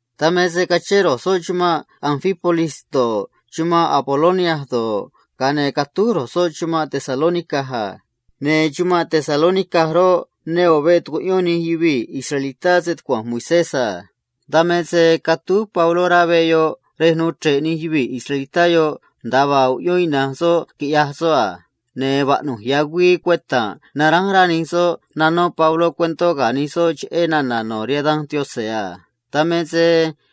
Dan me se cachén ro̱j soꞌ chumanꞌ Anfípolis do̱ꞌ, chumanꞌ Apolonia do̱ꞌ, ga̱a ne̱ catúj ro̱j soꞌ chumanꞌ Tesalónica a. Ne̱ chumanꞌ Tesalónica roꞌ, ne ꞌo̱ veꞌ tucuꞌyón nij yuvii̱ israelitá stucua̱nj Moisés a. Dan me se catúj Pabló rá veꞌ yoꞌ rej nuu chre̱ꞌ nij yuvii̱ israelitá yoꞌ, nda̱a vaa uꞌyón ina̱nj soꞌ quiꞌya̱j soꞌ a. Ne̱ vaꞌnu̱j ya̱ güii cueta̱nꞌ naránj rá nij soꞌ nataꞌ Pabló rihaan nij soꞌ cheꞌé nana̱ no̱ rihaan Danj Yaꞌanj a. Dan me se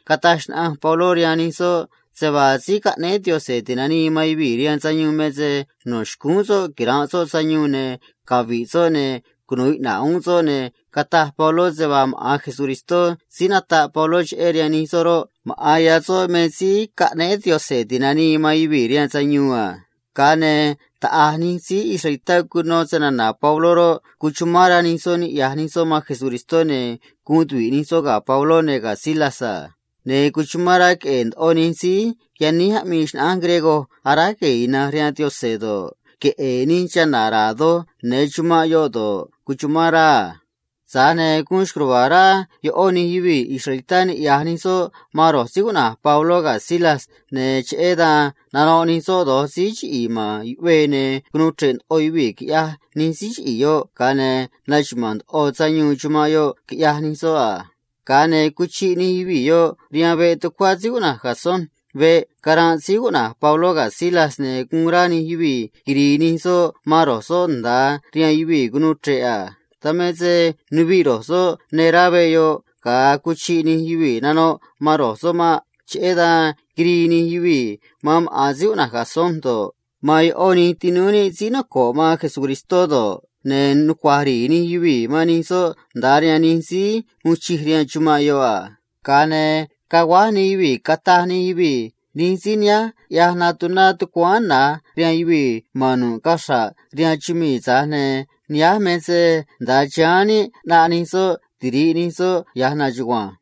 cataj xnaꞌanj Pabló rihaan nij soꞌ se vaa Síí Caꞌnéé Yaꞌanj Ti̱nanii man Yuvii̱ rihaan Sayuun me se vaa cheꞌé quira̱nꞌ soꞌ sayuun ne̱ cavi̱ꞌ soꞌ ne̱ cunu̱u iꞌna̱ꞌ uún soꞌ a. Ne̱ cataj Pabló se vaa maꞌa̱n Jesús síí nataꞌ Pabló cheꞌé rihaan nij soꞌ roꞌ, maꞌa̱n ya̱ soꞌ me Síí Caꞌnéé Yaꞌanj Ti̱nanii man Yuvii̱ rihaan Sayuun a. Ga̱a ne̱ taꞌa̱j nij síí israelitá cuno snana̱ Pabló roꞌ, cuchumán rá nij soꞌ niꞌya̱j nij soꞌ man Jesucristó, ne̱ guun tuvi̱ꞌ nij soꞌ ga̱ Pabló ne̱ ga̱ Silas a. Ne̱ cuchumán rá queꞌe̱e̱ ndoꞌo nij síí yaníj aꞌmii xnaꞌánj griego aráj gue̱e̱ ina̱nj rihaan Yaꞌanj do̱ꞌ, queꞌe̱e̱ nij chana̱ ra̱a̱ doj ya̱nj chumanꞌ yoꞌ do̱ꞌ a. Tza̱j ne̱ guun xco̱j ruva̱a̱ rá ꞌó nij yuvii̱ israelitá niꞌya̱j nij soꞌ man Pabló ga̱ Silas, ne̱ cheꞌé dan nanoꞌ nij soꞌ do̱j síí chiꞌi̱i̱ ma̱n yuꞌvee a. Ne̱ cunuu chre̱ꞌ ndoꞌo yuvii̱, quiꞌyaj nij síí chiꞌi̱i̱ yoꞌ, ga̱a ne̱ naxuma̱a̱n ndoꞌo sayuun chumanꞌ yoꞌ, quiꞌyaj nij soꞌ a. Ga̱a ne̱ cuchiꞌ nij yuvii̱ yoꞌ rihaan veꞌ tucuá síí cuꞌna̱j Jasón veꞌ caranꞌ Pabló ga̱ Silas, ne̱ guun rá nij yuvii̱ quiri̱i̱ nij soꞌ man ro̱j soꞌ nda̱a rihaan yuvii̱ cunuu chre̱ꞌ a. Dan me se nuviꞌ ro̱j soꞌ yáán rá veꞌ yoꞌ ga̱a cuchiꞌ nij yuvii̱ nanoꞌ man ro̱j soꞌ maꞌ. Cheꞌé dan quirii nij yuvii̱ man maꞌa̱n síí cuꞌna̱j Jasón do̱ꞌ, man ꞌó nij tinúú níꞌ síí noco̱ꞌ man Jesucristó do̱ꞌ, ne̱ nucua̱j ri̱i̱ nij yuvii̱ man nij soꞌ nda̱a rihaan nij síí uun chij rihaan chumanꞌ yoꞌ a. Ga̱a ne̱ caguáj nij yuvii̱, cataj nij yuvii̱ a: ―Ro̱j síí nihánj ꞌyaj natuná tucuáán na̱j rihaan yuvii̱ ma̱n nu̱ꞌ caxra̱ꞌ chumii̱, tza̱j ne̱ nihánj me se nda̱a chiháán níꞌ ꞌnaꞌ ro̱j soꞌ tiri̱ꞌ ro̱j soꞌ stucua̱nj níꞌ ya̱j na̱nj chugua̱nj.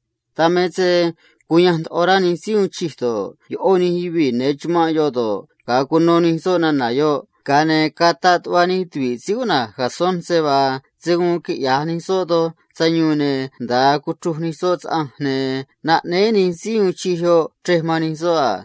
Dan me se cuyanj ndoꞌo rá nij síí uun chij do̱ꞌ, ꞌó nij yuvii̱ ya̱nj chumanꞌ yoꞌ do̱ꞌ, ga̱a cuno nij soꞌ nana̱ yoꞌ a. Ga̱a ne̱ cataꞌ tuꞌva nij tuvi̱ꞌ Jasón se vaa se̱ guun quiꞌya̱j nij soꞌ doj sayuun, ne̱ nda̱a cuchruj nij soꞌ saꞌanj, ne̱ naꞌnéé nij síí uun chij yoꞌ chrej man nij soꞌ a.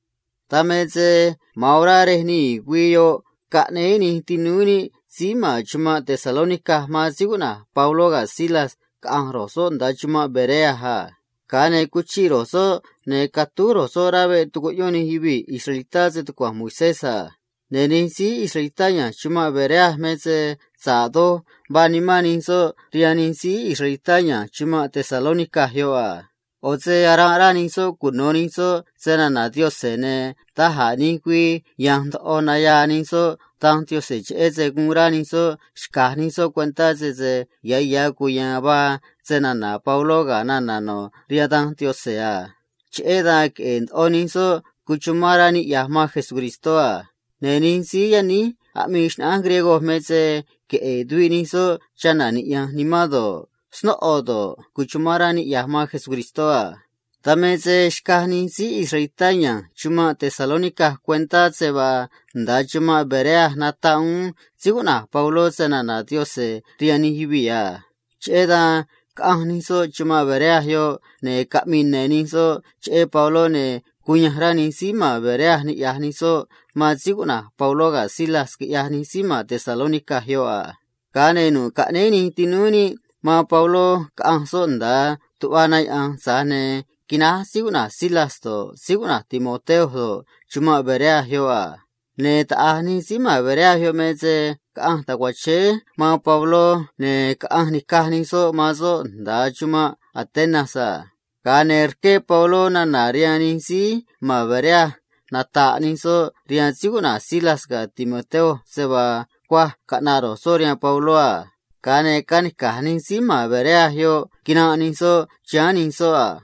Dan me se ma̱an orá rej nii̱ güii yoꞌ caꞌnéé nij tinúú níꞌ síí ma̱n chumanꞌ Tesalónica man Pabló ga̱ Silas caꞌa̱nj ro̱j soꞌ nda̱a chumanꞌ Berea a. Ga̱a ne̱ cuchiꞌ ro̱j soꞌ, ne̱ catúj ro̱j soꞌ rá veꞌ tucuꞌyón nij yuvii̱ israelitá stucua̱nj Moisés a. Ne̱ nij síí israelitá ya̱nj chumanꞌ Berea me se sa̱ꞌ doj vaa nimán nij soꞌ rihaan nij síí israelitá ya̱nj chumanꞌ Tesalónica a. ꞌO̱ se aranꞌ rá nij soꞌ cuno̱ nij soꞌ snana̱ Yaꞌanj, ne̱ da̱j a̱ nij güii ya̱nj ndoꞌo nayaa nij soꞌ Danj Yaꞌanj, cheꞌé se guun rá nij soꞌ xca̱j nij soꞌ cuentá sese ya̱ ya̱ cuya̱a̱n vaa snana̱ Pabló ga̱ nana̱ no̱ rihaan Danj Yaꞌanj a. Cheꞌé dan queꞌe̱e̱ ndoꞌo nij soꞌ cuchumán rá niꞌya̱j man Jesucristó a. Ne̱ nij síí yaníj aꞌmii xnaꞌánj griego me se queꞌe̱e̱ tuviꞌ nij soꞌ chana̱ niꞌya̱nj nimán do̱ꞌ, snóꞌo do̱ꞌ, cuchumán rá niꞌya̱j man Jesucristó a. Dan me se xcaj nij síí israelitá ya̱nj chumanꞌ Tesalónica cuentá se vaa nda̱a chumanꞌ Berea nataꞌ uún Pabló snana̱ Yaꞌanj rihaan nij yuvii̱ a. Cheꞌé dan caꞌanj nij soꞌ chumanꞌ Berea, ne̱ caꞌmii ne̱ nij soꞌ cheꞌé Pabló, ne̱ cuyanj rá queꞌe̱e̱ ndoꞌo nij síí ma̱n Berea niꞌya̱j nij soꞌ man Pabló ga̱ Silas, quiꞌyaj nij síí ma̱n Tesalónica yoꞌ a. Ga̱a ne̱ nu̱ꞌ caꞌnéé nij tinúú níꞌ man Pabló caꞌa̱nj soꞌ nda̱a tuꞌva na yaꞌa̱nj, tza̱j ne̱ quináj Silas do̱ꞌ, Timoteo do̱ꞌ, chumanꞌ Berea yoꞌ a. Ne̱ taꞌa̱j nij síí ma̱n Berea me se caꞌanj tacuachéé man Pabló, ne̱ caꞌanj nica̱j nij soꞌ man soꞌ nda̱a chumanꞌ Atenas a. Ga̱a ne̱ rqué Pabló nana̱ rihaan nij síí ma̱n Berea nata̱ꞌ nij soꞌ rihaan Silas ga̱ Timoteo se vaa cuaj caꞌna̱ꞌ ro̱j soꞌ rihaan Pabló a. Ga̱a ne̱ canica̱j nij síí ma̱n Berea yoꞌ quinanꞌ nij soꞌ chiháán nij soꞌ a.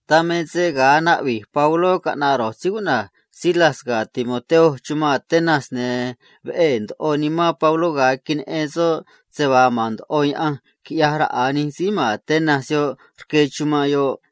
Dan me se ga̱a naꞌvi̱j Pabló caꞌna̱ꞌ Silas ga̱ Timoteo chumanꞌ Atenas, ne̱ veꞌee̱ ndoꞌo nimán Pabló ga̱a queneꞌen soꞌ se vaa ma̱n ndoꞌo yaꞌanj quiꞌyaj raꞌa̱ nij síí ma̱n Atenas rque chumanꞌ yoꞌ a.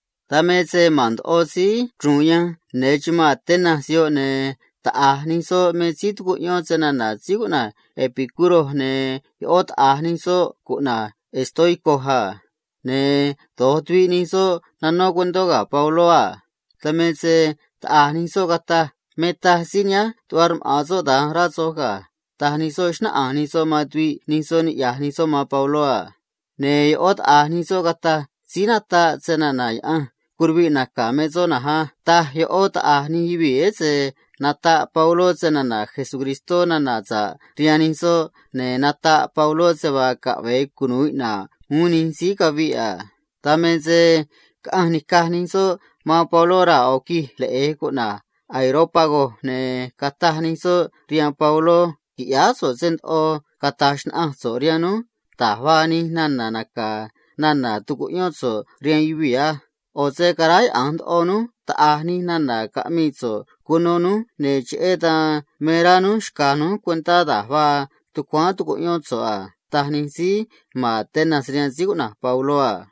Dan me se ma̱n ndoꞌo síí chru̱u̱n yanj ne̱ chumanꞌ Atenas, ne̱ taꞌa̱j nij soꞌ me síí tucuꞌyón snana̱ síí cuꞌna̱j Epicuro, ne̱ ꞌó taꞌa̱j nij soꞌ cuꞌna̱j estoico a. Ne̱ do̱j tuviꞌ nij soꞌ aꞌmii anó tuviꞌ ga̱ Pabló a. Dan me se taꞌa̱j nij soꞌ cataj a: ―Me taj síí nihánj tuꞌva rmaꞌa̱n soꞌ da̱nj, rá soj ga̱ ―taj nij soꞌ, xnáꞌanj nij soꞌ man tuviꞌ nij soꞌ, niꞌya̱j nij soꞌ man Pabló a. Ne̱ ꞌó taꞌa̱j nij soꞌ cataj a: ―Síí aꞌmii natáj snana̱ yaꞌanj curuviꞌ naca̱ me soꞌ na̱nj á ―taj ꞌó taꞌa̱j nij yuvii̱, ese nataꞌ Pabló nana̱ sa̱ꞌ cheꞌé Jesús rihaan nij soꞌ, ne̱ nataꞌ Pabló se vaa caꞌve̱e cunu̱u iꞌna̱ꞌ uún nij síí caviꞌ a. Dan me se caꞌanj nica̱j nij soꞌ man Pabló raa̱ ꞌo̱ quij leꞌe̱j cuꞌna̱j Areópago, ne̱ cataj nij soꞌ rihaan Pabló a: ―Qui̱ꞌyáá so̱ꞌ se ndoꞌo cata̱j xnaꞌanj so̱ꞌ rihaan núj da̱j vaa nij nana̱ naca̱ nana̱ tucuꞌyón so̱ꞌ rihaan yuvii̱ á. ꞌO̱ se caráyaꞌa̱nj ndoꞌo núj quiꞌyaj taꞌa̱j nij nana̱ caꞌmii so̱ꞌ cuno núj, ne̱ cheꞌé dan me rá núj xca̱j núj cuentá da̱j vaa tucuáán tucuꞌyón so̱ꞌ a ―taj nij síí ma̱n Atenas rihaan Pabló a.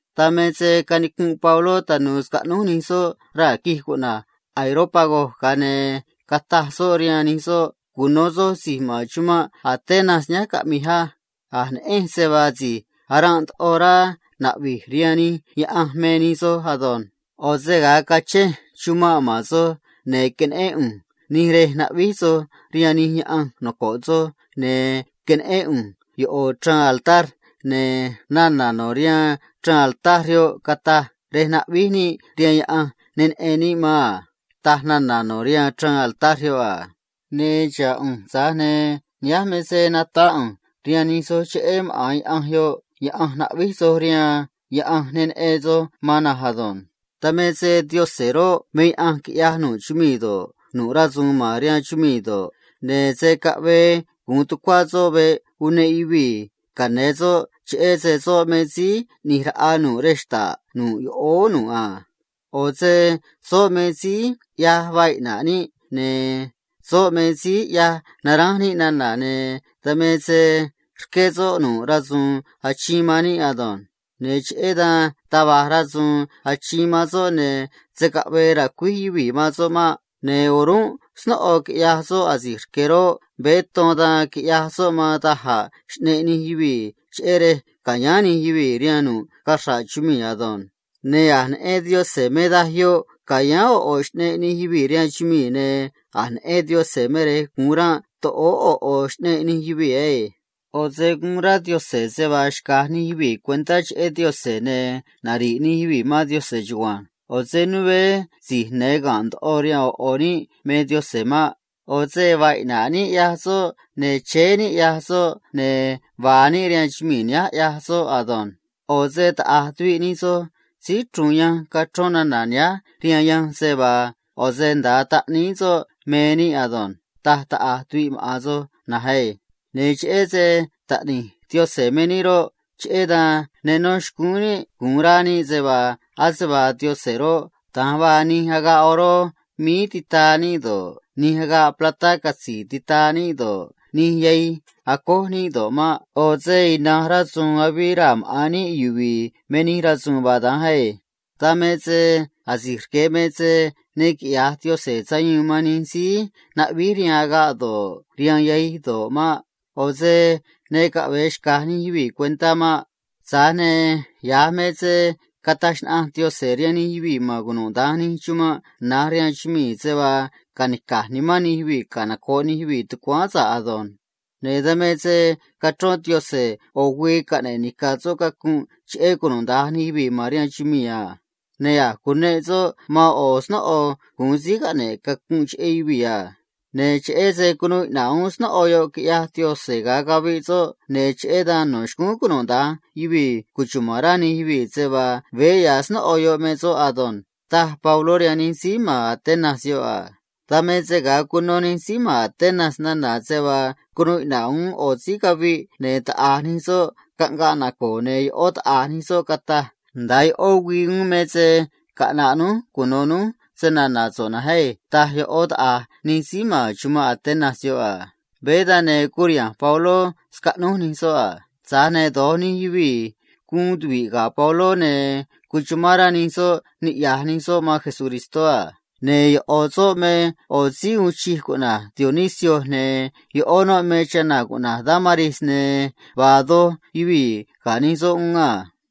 Dan me se canicunꞌ Pabló tanu̱u̱ scaꞌnúj nij soꞌ raa̱ quij cuꞌna̱j Areópago, ga̱a ne̱ cataj soꞌ rihaan nij soꞌ a: ―Cuno̱ soj si̱j ma̱n chumanꞌ Atenas nihánj caꞌmi̱j á. A̱j neꞌenj se vaa si̱j aranꞌ ndoꞌo rá cara̱a̱ gue̱e̱ rihaan nij yaꞌanj me nij soj ado̱nj. ꞌO̱ se ga̱a cachenj chumanꞌ ma̱n soj, ne̱ queneꞌén ꞌu̱nj nij rej aráj gue̱e̱ soj rihaan nij yaꞌanj noco̱ꞌ soj, ne̱ queneꞌén ꞌu̱nj ꞌo̱ chraan altar, ne̱ nana̱ no̱ rihaan chraan altar yoꞌ cataj, “Rej aráj gue̱e̱ níꞌ rihaan yaꞌanj ne neꞌen níꞌ man a”, taj nana̱ no̱ rihaan chraan altar yoꞌ a. Ne̱ xa̱ꞌ ꞌu̱nj, tza̱j ne̱ nihánj me se nata̱ꞌ ꞌu̱nj rihaan nij soj cheꞌé maꞌa̱n yaꞌanj yoꞌ yaꞌanj aráj gue̱e̱ soj rihaan, yaꞌanj ne neꞌen soj man na̱nj ado̱nj. ’Dan me se Yaꞌanj roꞌ, me yaꞌanj quiꞌyaj nu̱ꞌ chumii̱ do̱ꞌ, nu̱ꞌ rasu̱u̱n ma̱n rihaan chumii̱ do̱ꞌ, ne̱ se̱ caꞌvee gu̱un tucua̱ soꞌ veꞌ uneꞌ yuvii̱ ca̱yáán soꞌ, cheꞌé se soꞌ me Síí ꞌNi̱j Raꞌa nu̱ꞌ rej xta̱ꞌ nu̱ꞌ yoꞌóó nu̱ꞌ a. ꞌO̱ se soꞌ me síí ꞌyaj vaa iꞌna̱ꞌ níꞌ, ne̱ soꞌ me síí ꞌyaj naránj níꞌ nana̱, ne̱ dan me se rqué soꞌ nu̱ꞌ rasu̱u̱n achiin man níꞌ ado̱nj. Ne̱ cheꞌé dan taj va̱j rasu̱u̱n achiin man soꞌ, ne̱ se̱ caꞌvee ra̱cuíj yuvii̱ man soꞌ maꞌ. Ne̱ o̱rúnꞌ snóꞌo quiꞌyaj soꞌ asi̱j rque̱ roꞌ, veé ton dan quiꞌyaj soꞌ man da̱j a̱ xꞌneꞌ nij yuvii̱ aꞌmii ꞌo̱ ꞌo̱ xnaꞌánj, cheꞌé rej ca̱yáán nij yuvii̱ rihaan nu̱ꞌ cachra̱ꞌ chumii̱ ado̱nj. Ne̱ a̱j neꞌen Yaꞌanj me daj yoꞌ ca̱yáán ꞌo̱ ꞌo̱ xꞌneꞌ nij yuvii̱ rihaan chumii̱, ne̱ a̱j neꞌen Yaꞌanj me rej gu̱un ranꞌ toꞌóó ꞌo̱ ꞌo̱ xꞌneꞌ nij yuvii̱ na̱nj á. ꞌO̱ se guun rá Yaꞌanj se vaa xca̱j nij yuvii̱ cuentá cheꞌé Yaꞌanj ne̱ nari̱ꞌ nij yuvii̱ man Yaꞌanj chugua̱nj. ꞌO̱ se né si̱j ya̱nj ga̱nꞌ ndoꞌo rihaan ꞌo̱ ꞌo̱ níꞌ me Yaꞌanj maꞌ. ꞌO̱ se vaa iꞌna̱ꞌ níꞌ, ꞌyaj soꞌ, ne̱ chéé níꞌ, ꞌyaj soꞌ, ne̱ vaa níꞌ rihaan chumii̱ nihánj, ꞌyaj soꞌ ado̱nj. ꞌO̱ se taꞌa̱j tuviꞌ nij soj síí chru̱u̱n yanj cachrón nana̱ nihánj rihaan yanj a: “ꞌO̱ se nda̱a taꞌníí soꞌ me níꞌ ado̱nj”, taj taꞌa̱j tuviꞌ maꞌa̱n soj na̱nj á. Ne̱ cheꞌé se taꞌni̱j Yaꞌanj me níꞌ roꞌ, cheꞌé dan ne nó xcúún níꞌ gu̱un rá níꞌ se vaa ase vaa Yaꞌanj roꞌ, da̱nj vaa nij agaꞌ oró míí titaa níꞌ do̱ꞌ, nij agaꞌ platá catzi̱i̱ titaa níꞌ do̱ꞌ, nij yahij acój níꞌ do̱ꞌ maꞌ. ꞌO̱ se ina̱nj rasu̱u̱n avii raa̱ maꞌa̱n níꞌ yuvi̱i̱ me nij rasu̱u̱n vaa da̱nj na̱nj á. ’Dan me se asi̱j rque̱ me se ne quiꞌya̱j Yaꞌanj sayuun man nij síí aráj gue̱e̱ rihaan agaꞌ do̱ꞌ, rihaan yahij do̱ꞌ maꞌ. ꞌO̱ se ne caꞌve̱e xca̱j nij yuvii̱ cuentá maꞌ. Tza̱j ne̱ ya̱j me se cataj xnaꞌanj Yaꞌanj rihaan nij yuvii̱ ma̱n cunuda̱nj nij chumanꞌ na̱j rihaan chumii̱ se vaa ca̱nica̱j nimán nij yuvii̱ canoco̱ꞌ nij yuvii̱ tucuáán sa̱ꞌ ado̱nj. Ne̱ dan me se cachrón Yaꞌanj ꞌo̱ güii caꞌne̱ꞌ nica̱ soꞌ cacunꞌ cheꞌé cunuda̱nj nij yuvii̱ ma̱n rihaan chumii̱ a. Ne̱ a̱j cuneꞌ soꞌ man ꞌo̱ snóꞌo guun síí caꞌne̱ꞌ cacunꞌ cheꞌé yuvii̱ a. Ne̱ cheꞌé se cunuu iꞌna̱ꞌ uún snóꞌo yoꞌ, quiꞌyaj Yaꞌanj, ga̱a caviꞌ soꞌ, ne̱ cheꞌé dan no̱ xcúún cunuda̱nj yuvii̱ cuchuma̱n rá nij yuvii̱ se vaa veé ya̱ snóꞌo yoꞌ me soꞌ ado̱nj ―taj Pabló rihaan nij síí ma̱n Atenas yoꞌ a. Dan me se ga̱a cuno nij síí ma̱n Atenas nana̱ se vaa cunuu iꞌna̱ꞌ uún ꞌo̱ síí caviꞌ, ne̱ taꞌa̱j nij soꞌ caꞌngaꞌ naco̱o̱, ne̱ ꞌó taꞌa̱j nij soꞌ cataj a: ―Nda̱a ꞌó güii uún me se caꞌna̱ꞌ núj cuno̱ núj snana̱ so̱ꞌ na̱nj á ―taj ꞌó taꞌa̱j nij síí ma̱n chumanꞌ Atenas a. Veé dan, ne̱ curiha̱nj Pabló scaꞌnúj nij soꞌ a. Tza̱j ne̱ do̱j nij yuvii̱ guun tuvi̱ꞌ ga̱ Pabló, ne̱ cuchumán rá nij soꞌ niꞌya̱j nij soꞌ man Jesucristó a. Ne̱ ꞌo̱ soꞌ me ꞌo̱ síí uun chij cuꞌna̱j Dionisio, ne̱ ꞌó noꞌ me chana̱ cuꞌna̱j Dámaris, ne̱ vaa doj yuvii̱ uún a.